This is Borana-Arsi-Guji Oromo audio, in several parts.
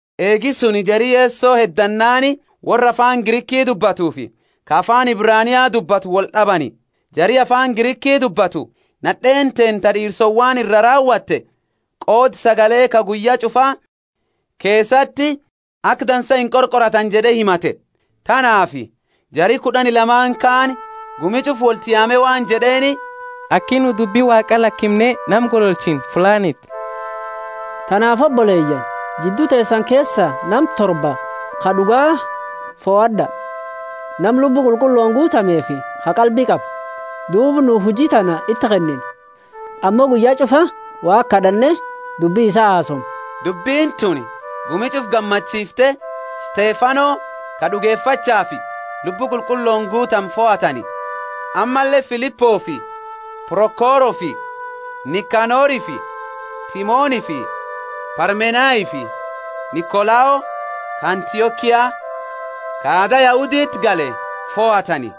Eegi suni jari Yeso heddannaani worra afaani Griki dubbatufi ka afaani Ebrania dubbatu wold'abani. Jari afaani Griki dubbatu nad'eeni teenna ta d'iirsowani iraa raawate, qooda sagale ka guyya ch'ufa keesati aka dansa inqorqoratani jed'e himate. Tanaafi jari kud'ani lamaani kaani gumi ch'ufa wolti yaame waan jed'eeni, Aki nu Dubbi Waaqa lakimne nama gololchinu fuulaaniti. Tanaafi oboleyaani, jiddu teesani keesa nama torba, ka d'uga, fohad'a, nama Lubbu Qulqullooni guutamefi ka qalbi qabu, duuba nu huji tana iti kennina. Ammo nu guyya ch'ufa Waaqa kad'anne dubbi isaa hasoomna. Dubbini tuni gumi ch'ufa gammachiifte, Stefano ka d'ugefachaafi Lubbu Qulqullooni guutame fohatani, ammalle Filipofi Prokorofi Nikanorifi Timonifi Parmenafi Nikolao, ka Antiokia, ka aada Yahuditi gale fohatani.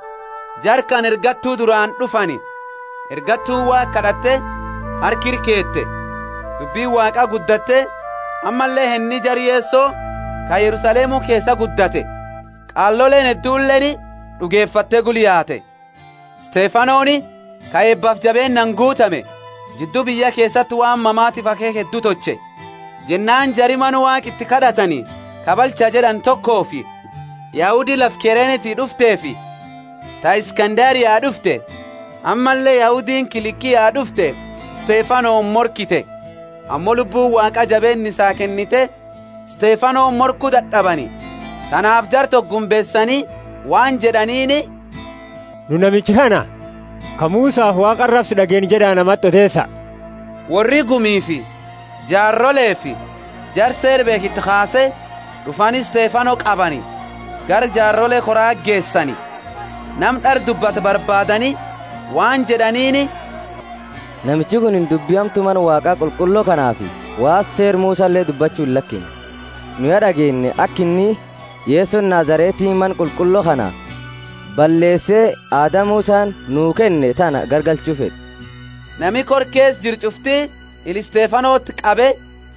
Jara kana ergattu duraani d'ufani, ergattuuni Waaqa kad'atte harka ira keete. Dubbini Waaqa guddatte, ammalle henni jara Yeso ka Yerusalemu keesa guddate, qaaloleeni hedduleeni d'ugefatte gula yaate. Stefanoni ka eebafi jabeennaani guutame, jiddu biyya keesati waan mamafi akheekha heddu tolche. Jennaani jari mana Waaqa iti kad'atani ka balcha jed'ani tokofi, Yahudi lafa Kireneti d'ufteefi ta Iskanderia d'ufte, ammalle Yahudiini Kilikia d'ufte Stefanoni morkite. Ammo Lubbuuni Waaqa jabeenna isaa kennite, Stefanoni morku dad'abani. Tanaafi jara toko gumbeesani waan jed'aniini, Nu namicha kana ka Musafi Waaqa arabsu, d'ageenne jed'a namati odeesa. Worri gumifi jaarolefi jara Seera beekhu iti kaase, d'ufani Stefano qabani, gara jaarole kora geesani. Nama d'ara dubbatu barbaadani waan jed'aniini, namichi kunini dubbi hamtu Mana Waaqa qulqullo kanaafi waan Seera Musale dubbachu illakimne jed'a. Nu ya d'ageenne aka inni, Yesoni Nazareti mana qulqullo kana balleese aada Musani nuu kenne tana garagalcha jed'u! Nami kora keesa jiru ch'ufti ila Stefanoti qabe,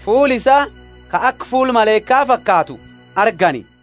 fuula isaa ka aka fuula malaika fakaatu argani.